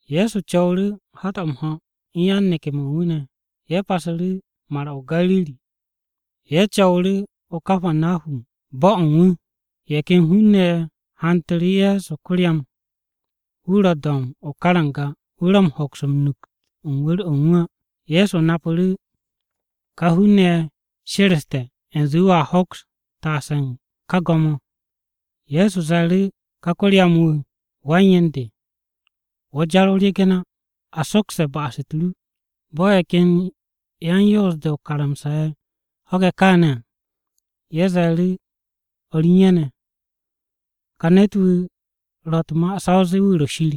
Ye̱so co̱wu̱ru̱ hat-o̱ m-ho̱, u̱n yan-neke̱-mo̱ u̱n wu̱ ne̱. Ye̱ pasu̱ru̱ Mar-o̱ o-Gariri, ye̱ co̱wu̱ru̱ o-Kapanahum bo̱-o̱ u̱n wu̱. Ye̱ ken hun-ne̱ ye̱ hantu̱ru̱ Ye̱so ko-ryam. Wu̱ ro do̱mb o-karanga, wu̱ ro m-hoks u̱n nukt u̱n wu̱r-o̱ u̱n wu̱ á. Ye̱so napu̱ru̱ ká hun-ne̱ ye̱ she̱re̱ste̱ u̱nze Ye̱so a hoks taase u̱n wu̱ ká go̱m-o̱. Ye̱so ze̱e̱ru̱ ká ko-ryam-wu̱, “Wan-yen de, wo̱ jar o-regen á, a sokste̱ ba'as-u̱t ru!” Bo̱ ye̱ ken yan-Yoos-de o-karamsa ye̱ ho̱ge̱ káane̱ à, ye̱ ze̱e̱ru̱ o̱r u̱n ye̱ ne̱, “Ka ne̱t-wu̱ ro̱ u̱t-ma sa o zee wu̱ ro̱ Shir.”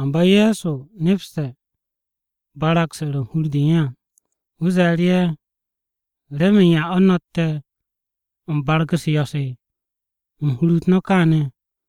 Amba Ye̱so nepste̱ barag-se ro̱ u̱n hur-de u̱n ye̱ à. Wu̱ ze̱e̱ru̱ ye̱, “¿Remen yan o̱ no̱tte̱ u̱n barag-u̱s yo̱-se u̱n hur-u̱t no̱ káane̱?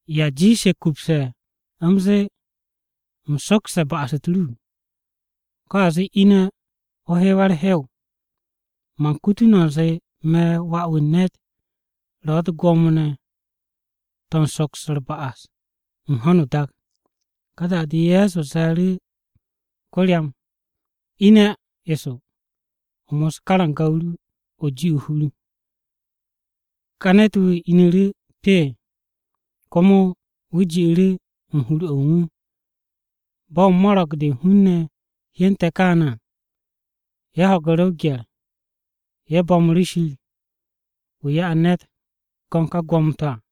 ¿Ya jiishe̱ kupse̱, u̱m zee, ‘U̱m sokste̱ ba'as-u̱t ru,’ ko̱ a zee, ‘Ine̱ o hewwe̱ u̱r-hew?’ Man kutu no̱ u̱nze, me̱ Wà-wu̱ u̱n ne̱t ro̱ u̱t-gwo̱mo ne̱ to̱ u̱n soks u̱t-ba'as u̱n ho̱no o-dak.” Ka da-de, Ye̱so ze̱e̱ru̱ ko-ryam, “Ine̱ eso, o mos karanga-o ru, o ji o-hur.” Ká ne̱t-wu̱ inu̱ru̱ pee, komo wu̱ ji'u̱ru̱ u̱n hur-o̱ u̱n wu̱. Bo̱ mo̱ro̱g-de u̱n hun-ne̱ hyente̱ kaane̱ à, ye̱ ho̱gu̱ru̱ o-gye̱r. Ye̱ bo̱mu̱ru̱ Shir, wu̱ ya'e̱ ne̱t go̱n ka gwo̱mo-to̱ à.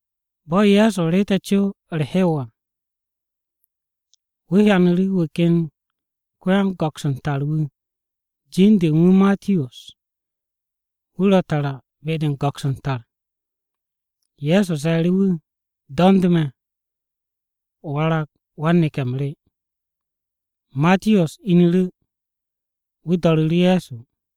Bo̱ Ye̱so reete̱ co u̱r-hew à, wu̱ hyanu̱ wu̱ ken ko-yan-go̱ks u̱n tar wu̱. Jin-de u̱n wu̱ Matiyos. Wu̱ ro tara be-de u̱n go̱ks u̱n tar. Ye̱so ze̱e̱ru̱ wu̱, “Do̱nd me̱, o warag wan-neke̱-m re.” Matiyos inu̱ru̱, wu̱ do̱ru̱ru̱ Ye̱so.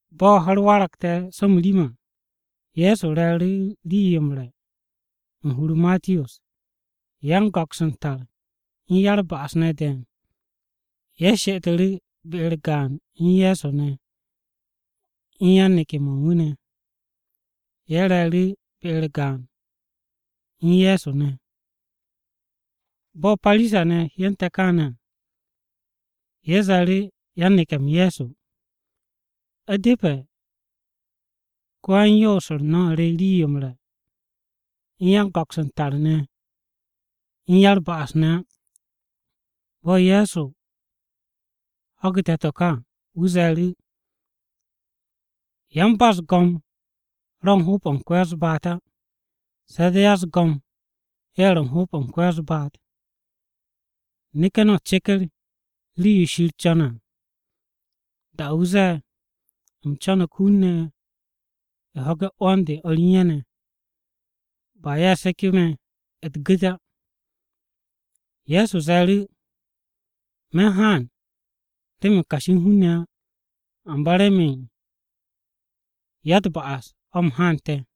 Bo̱ ho̱-u̱r warge̱ so m-rim à, Ye̱so re̱e̱ru̱ rii-yo m-re̱ u̱n hur-o Matiyos. Yan-go̱ks u̱n tar u̱n ya-u̱r-ba'as ne̱ de̱e̱n, ye̱ she'etu̱ru̱ be-u̱r gaan u̱n Ye̱so ne̱ u̱n yan-neke̱-mo̱ u̱n wu̱ ne̱. Ye̱ re̱e̱ru̱ be-u̱r gaan u̱n Ye̱so ne̱. Bo̱ Parisa-ne̱ hyente̱ káane̱ à, ye̱ ze̱e̱ru̱ yan-neke̱-m Ye̱so. “U̱depe̱ ko-yan-yoos-u̱r no̱ re rii-yo m-re̱ u̱n yan-go̱ks u̱n tar ne̱, u̱n ya-u̱r-ba'as ne̱ á.” Bo̱ Ye̱so ho̱gu̱te̱ to̱ ka à, wu̱ ze̱e̱ru̱, “Yan-ba-u̱s-go̱m ro̱ u̱n hoob-o̱ ko-ya-u̱s-baat á, se̱ de̱ ya-u̱s-go̱m ye̱ ro̱ m-hoob u̱n ko-ya-u̱s-baat. Neke̱ no̱ ceker rii-yo Shir co̱ne̱ à, da-o̱ wu̱ zee, ‘U̱m co̱no̱g hun-ne̱ ho̱ge̱ 'wo̱n-u̱r o̱r re u̱n ye̱ ne̱, ba ye̱ seke̱ me̱ u̱t-gu̱t á.’” Ye̱so ze̱e̱ru̱, “Me̱ u̱n haan remen kashi u̱n hun-ne̱ á, amba remen ya-u̱t-ba'as o̱ u̱m haante̱.”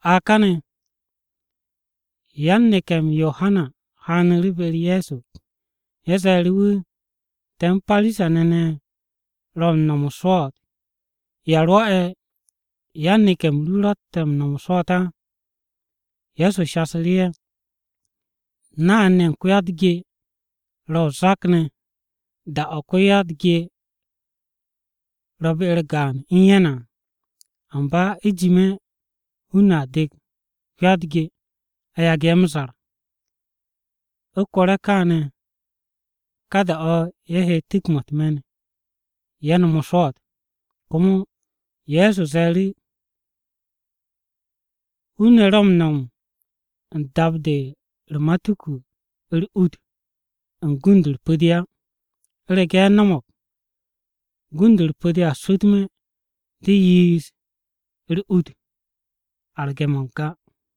A káne̱ yan-neke̱-m Yohana Wa-m-Yo'os u̱n hun-ne̱ m-ho̱ haanu̱ru̱ be-u̱r Ye̱so. Ye̱ ze̱e̱ru̱ wu̱ “Te̱ u̱n Parisa-ne̱ ne̱ ro̱ u̱n no̱m o-swo̱o̱t, ¿ya rwo̱'e̱ yan-neke̱-m ru ro̱tte̱ m-no̱m o-swo̱o̱t á?” Ye̱so shasu̱ru̱ ye̱, “Nay-ne̱ ye̱ u̱n ko-ya-u̱t-ge ro̱ o-zak ne̱ da-o̱ ko-ya-u̱t-ge ro̱ be-u̱r gaan u̱n ye̱ ne̱ à. Amba u̱jime̱ hun-ne̱ a dek ko-ya-u̱t-ge a yagu̱ ye̱ m-zar. U̱ kore̱ kaane̱ ká da-o̱ ye̱ he tu̱k-mo̱ u̱t-me̱n ye̱ nom o-swo̱o̱t.” Komo Ye̱so ze̱e̱ru̱, “Hun-ne̱ ro̱ m-no̱m u̱n dap-de u̱n u̱r-matuku u̱r-ut u̱n gund-u̱r pu̱-de á. U̱rege̱ ye̱ no̱mo̱g, gund-u̱r pu̱-de a swu̱tme̱ de yiish u̱r-ut arge̱-mo̱ n-ga.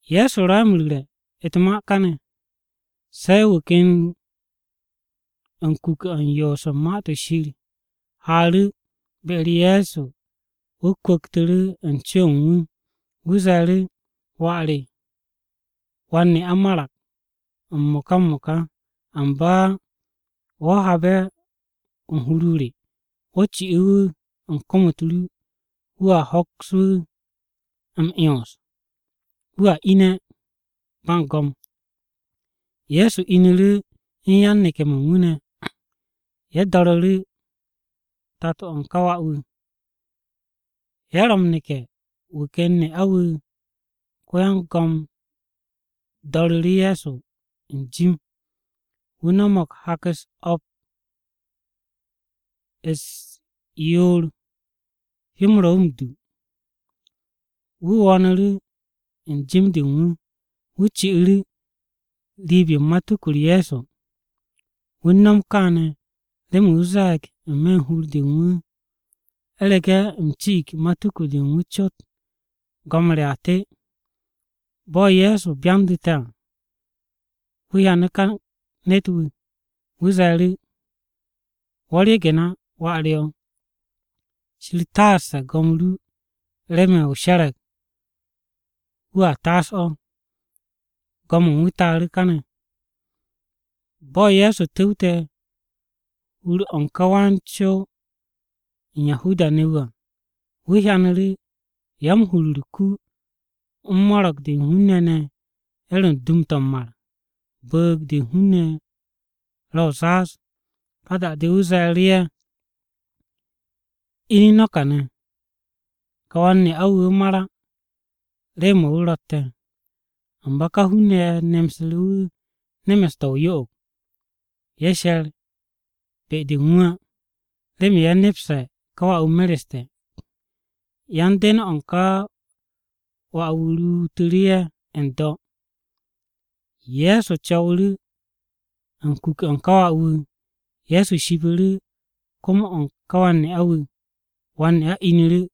Ye̱so ro̱ ye̱ m-ru̱re̱ u̱t-ma kane̱, se̱ wu̱ ken u̱n kuke̱-o̱ u̱n yoos u̱n Ma-to̱ Shir haaru̱ be-u̱r Ye̱so wu̱ kwu̱ktu̱ru̱ u̱n co-o̱ u̱n wu̱. Wu̱ ze̱e̱ru̱, “Wà re wan-ne'a marag m-mo̱ka m-mo̱ka, amba wo̱ haabe̱ hur-o re, wo̱ ci wu̱ u̱n kom-u̱t ru, wo̱a hoks wu̱ m-'yons, wu̱a ine̱ ba u̱n go̱m.” Ye̱so inu̱ru̱ u̱n yan-neke̱-mo̱ u̱n wu̱ ne̱, ye̱ do̱ru̱ru̱ tato-o̱ u̱n ka wà-wu̱. Ye̱ ro̱ m-neke̱ wu̱ ken ne'a wu̱, ko-yan-go̱m do̱ndu̱ru̱ Ye̱so n-jim. Wu̱ no̱mo̱g hak-u̱s o̱p u̱s-yoor hyó-m ro̱ m-du. Wu̱ wo̱o̱nu̱ru̱ u̱n jim-de u̱n wu̱, wu̱ ci'u̱ru̱ riib-yo u̱n matuku-u̱r Ye̱so. Wu̱ u̱n nom kaane̱ remen wu̱ ze̱e̱g n-me̱ u̱n hur-de u̱n wu̱, “U̱rege̱ u̱m ci'ig matuku-de u̱n wu̱ cot go̱m re a te.” Bo̱ Ye̱so byandu̱te̱ à, wu̱ hyanu̱ ká ne̱t-wu̱. Wu̱ ze̱e̱ru̱, “Wo̱ ryegen á wà re o̱, Shir taaste̱ go̱m ru remen o she̱re̱g wu̱a taas o̱.” Go̱m-o̱ u̱n wu̱ taaru̱ kane̱. Bo̱ Ye̱so tu̱wte̱ hur-o̱ u̱n ka wan-co-wu̱ u̱n Yahuda-ne̱ wu̱ à, wu̱ hyanu̱ru̱ ya-m-huru u̱r-ku u̱n mo̱ro̱g-de u̱n hun-ne̱ ne̱ ye̱ ro̱ u̱n dum-to̱ m-mar. Bu̱u̱g-de hun-ne̱ ro̱ o-zaaz. Ka da-de wu̱ ze̱e̱ru̱ ye̱, “Ine̱ no̱ kane̱! Ka wan-ne'a-wu̱, wu̱ mar á, rew-mo̱ wu̱ ro̱tte̱.” Amba ka hun-ne̱ ye̱ nemsu̱ru̱ wu̱ nemes-to̱ o-yo'og. Ye̱ she̱r be-de u̱n wu̱ á, remen ye̱ nepse̱ ka wà-wu̱ mereste̱. Yan-den-o̱ u̱n ka wà-wu̱ ruutu̱ru̱ ye̱ n-do̱. Ye̱so co̱wu̱ru̱ u̱n kuke̱-o̱ u̱n ka wà-wu̱. Ye̱so shipu̱ru̱ kom-o̱ u̱n ka wan-ne'a-wu̱, wan-ne'a inu̱ru̱!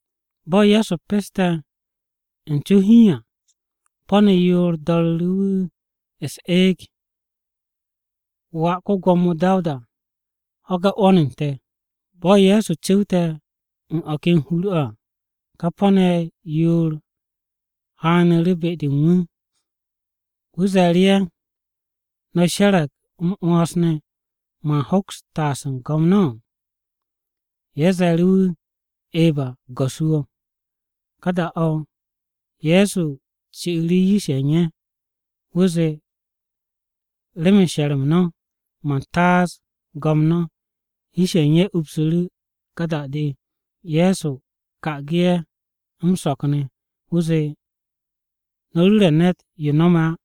Bo̱ Ye̱so peste̱ u̱n co hiin à, po̱-ne̱ yoor do̱ru̱ru̱ wu̱ u̱s-eeg, “Wà ko-Gwo̱mo Dawuda ho̱ge̱ 'wo̱n-u̱r te̱!” Bo̱ Ye̱so cu̱wte̱ u̱n o̱ ken hur-o̱ à ka po̱-ne̱ ye̱ yoor haaru̱ be-de u̱n wu̱. Wu̱ ze̱e̱ru̱ ye̱, “¿No̱ she̱re̱g m-'wo̱ns ne̱ man hoks taas u̱n go̱m no̱?” Ye̱ ze̱e̱ru̱ wu̱, “Eba, Go̱s-wu̱ o̱.” Ka da-o̱, Ye̱so ci'u̱ru̱ yish-ye̱ u̱n ye̱. Wu̱ zee, “Remen she̱r-m no̱, man taas go̱m no̱.” Yish-ye̱ u̱n ye̱ upsu̱ru̱. Ka da-o̱ Ye̱so ka'agu̱ ye̱ m-so̱k ne̱ wu̱ zee, “No̱ ru̱re̱ ne̱t yo no̱me̱ á.”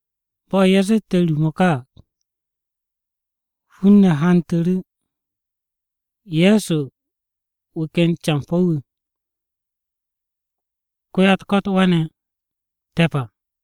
Bo̱ ye̱ zette̱ ru-mo̱ ka à, hun-ne̱ hantu̱ru̱ Ye̱so wu̱ ken campo̱-wu̱. Ko-ya-u̱t-ko̱t we̱ne̱g wu̱ te̱p.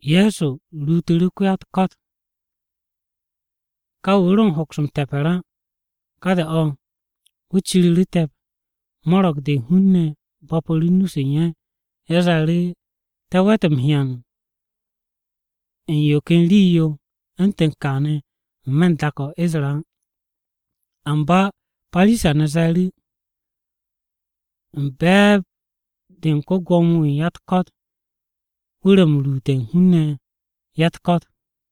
Ye̱so ruutu̱ru̱ ko-ya-u̱t-ko̱t, ka wu̱ ro u̱n hoks m-te̱pe̱r á, ka da-o̱ wu̱ ciru̱ru̱ te̱p. Mo̱ro̱g-de u̱n hun-ne̱ bo̱pu̱ru̱ nu-se u̱n ye̱. Ye̱ ze̱e̱ru̱, “Te̱ we̱t m-hyan u̱n yo ken rii-yo u̱ntu̱n kaane̱ n-me̱ u̱n dak-o̱ Isra-ne̱ á.” Amba Parisa-ne̱ ze̱e̱ru̱, “U̱n be̱e̱b-de u̱n ko-Gwo̱mo-wu̱ u̱n ya-u̱t-ko̱t wu̱ ro̱ m-ruute̱ u̱n hun-ne̱ ya-u̱t-ko̱t.”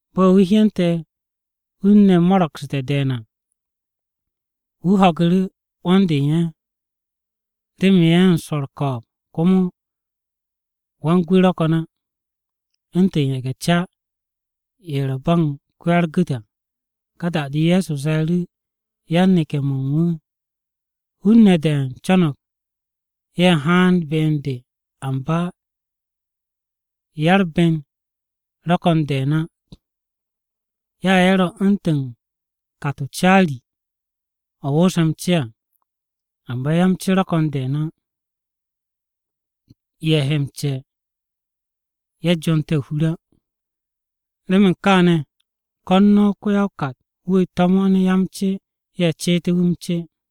Bo̱ wu̱ hyente̱ hun-ne̱ mo̱ro̱gsu̱te̱ de̱e̱n à, wu̱ ho̱gu̱ru̱ 'wo̱n-de u̱n ye̱, remen ye̱ u̱n swo̱ u̱r-ko̱o̱b. Komo wan-gwu̱ ro̱ ko̱n á, u̱ntu̱n ye̱ge̱-ca ye̱ ro̱ ba u̱n ko-ya-u̱r-gu̱t à. Ka da-de Ye̱so ze̱e̱ru̱ yan-neke̱-mo̱ u̱n wu̱, “Hun-ne̱ de̱e̱n co̱no̱g ye̱ haan be u̱n de, amba ya-u̱r-ben ro̱ ko̱n de̱e̱n á. Ya ye̱ ro̱ u̱ntu̱n kat-o caari-o̱ wo̱o̱se̱ m-ce à, amba ya-m-ce ro̱ ko̱n de̱e̱n á. Ye̱ he m-ce ye̱ jonte̱ o-hur á. Remen kaane̱, ko̱n no̱ ko-ya-o-kat-wu̱ to̱mo̱n ya-m-ce ye̱ ceete̱ wu̱ m-ce.”